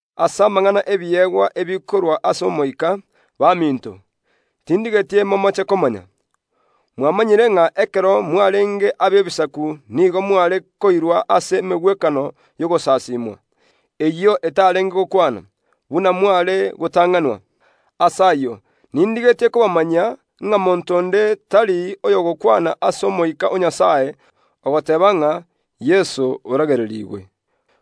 Ase amang’ana y’ebiegwa ebikorwa ase Omoika, baminto, tindigeti momoche komanya. Mwamanyire ng’a ekero mwarenge ab’Ebisaku nigo mware koirwa ase emegwekano y’ogosasimwa, eyio etarenge gokwana, buna mware gotang’anwa. Ase ayio nindigetie kobamanyia, ng’a monto onde tari oyogokwana ase Omoika o Nyasae ogoteeba ng’a, “Yeso oragererigwe!”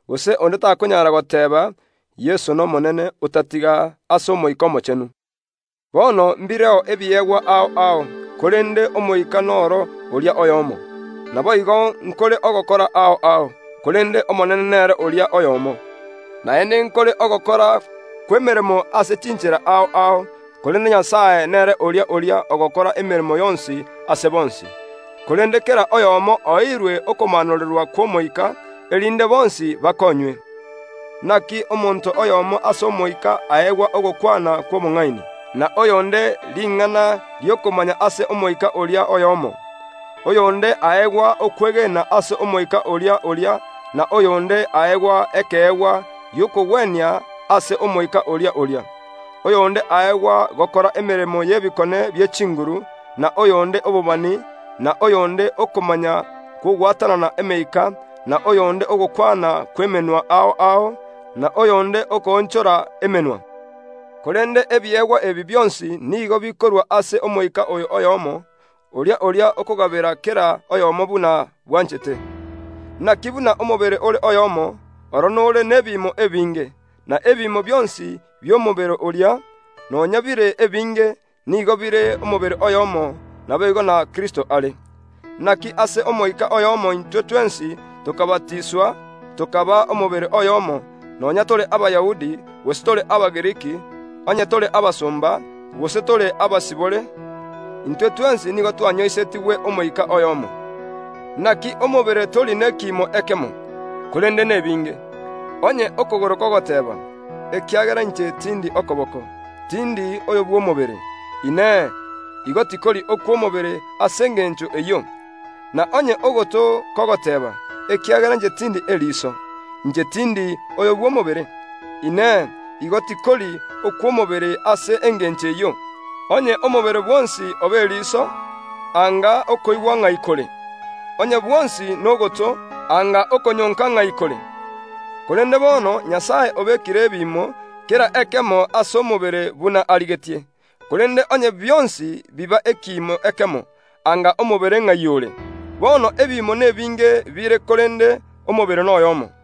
Gose onde takonyara goteeba, “Yeso n’Omonene”, otatiga ase Omoika Omochenu. Bono mbireo ebiegwa ao ao, korende Omoika noro oria oyomo. Naboigo nkore ogokora ao ao, korende Omonene nere oria oyomo. Naende nkore ogokora kw’emeremo ase chinchera ao ao, korende Nyasae nere oria oria ogokora emeremo yonsi ase bonsi. Korende kera oyomo oeirwe okomaanorerwa kw’Omoika, erinde bonsi bakonywe. Naki omonto oyomo ase Omoika aegwa ogokwana kw’obong’aini, na oyonde ring’ana ri’okomanya ase Omoika oria oyomo. Oyonde aegwa okwegena ase Omoika oria oria, na oyonde aegwa ekeegwa gi’okogwenia ase Omoika oria oria. Oyonde aegwa gokora emeremo y’ebikone bie chinguru, na oyonde obobani, na oyonde okomanya kw’ogwatanana emeika, na oyonde ogokwana kw’emenwa ao ao, na oyonde okoonchora emenwa. Korende ebiegwa ebi bionsi nigo bikorwa ase Omoika oyo oyomo, oria oria okogabera kera oyomo buna bwanchete. Naki buna omobere ore oyomo, oro nore nebiimo ebinge, na ebiimo bionsi bi’omobere oria, nonya bire ebinge, nigo bire omobere oyomo; naboigo na Kristo are. Naki ase Omoika oyomo intwe twensi tokabatiswa, tokaba omobere oyomo, nonya tore Abayahudi, gose tore Abagiriki, onye tore abasomba, gose tore abasibore; intwe twensi nigo twanyoisetigwe Omoika oyomo. Naki omobere tori nekiimo ekemo, korende nebinge. Onye okogoro kogoteeba, “Ekiagera inche tindi okoboko, tindi oyo bw’omobere”, Inee, igo tikori okw’omobere ase engencho eyio? Na onye ogoto kogoteeba, “Ekiagera inche tindi eriso, inche tindi oyo bw’omobere”, Inee, igo tikori okw’omobere ase engencho eyio? Onye omobere bwonsi oba eriso, anga okoigwa ng’ai kore? Onye bwonsi nogoto, anga okonyonka ng’ai kore? Korende bono Nyasae obekire ebiimo, kera ekemo ase omobere buna arigetie. Korende onye bionsi biba ekiimo ekemo, anga omobere ng’ai ore? Bono ebiimo nebinge bire, korende omobere noyomo.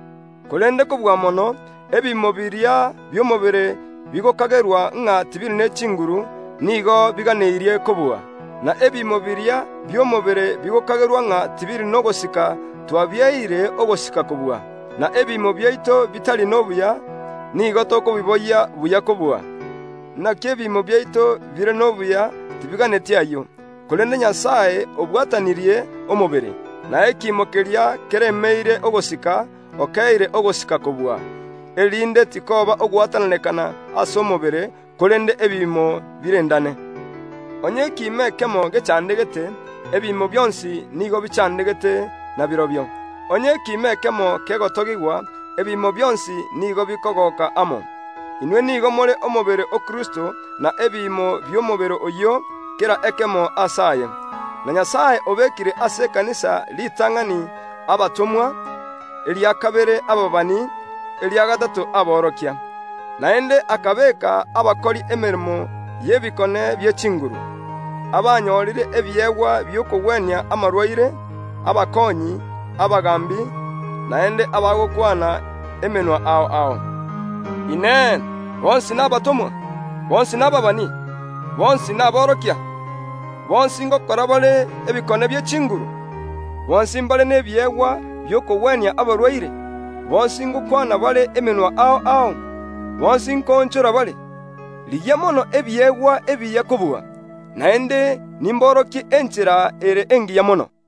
Korende kobua mono, ebiimo biria bi’omobere bigokagerwa ng’a tibiri ne chinguru, nigo biganeirie kobua. Na ebiimo biria bi’omobere bigokagerwa ng’a tibiri nogosika twabieire ogosika kobua; na ebiimo biaito bitari nobuya, nigo tokobiboyia buya kobua, naki ebiimo biaito bire nobuya tibiganeti ayio. Korende Nyasae obwatanirie omobere, na ekiimo keria keremeire ogosika okeire ogosika kobua, erinde tikoba ogwatananekana ase omobere, korende ebiimo birendane. Onye ekiimo ekemo gechandegete, ebiimo bionsi nigo bichandegete nabirobio; onye ekiimo ekemo kegotogigwa, ebiimo bionsi nigo bikogoka amo. Inwe nigo more omobere o Kristo na ebiimo bi’omobere oyio, kera ekemo aase aye. Na Nyasae obekire ase ekanisa ritang’ani abatomwa, eria kabere ababani, eria gatato aborokia. Naende akabeeka abakori emeremo y’ebikone bie chinguru, abanyorire ebiegwa bi’okogwenia amarwaire, abakoonyi, abaagambi, naende abagokwana emenwa ao ao. Inee! Bonsi nabatomwa? Bonsi nababani? Bonsi naborokia? Bonsi ngokora bare ebikone bie chinguru? Bonsi mbare nebiegwa bi’okogwenia abarwaire? Bonsi ngokwana bare emenwa ao ao? Bonsi nkoonchora bare? Rigia mono ebiegwa ebiya kobua. Naende nimborokie enchera ere engiya mono.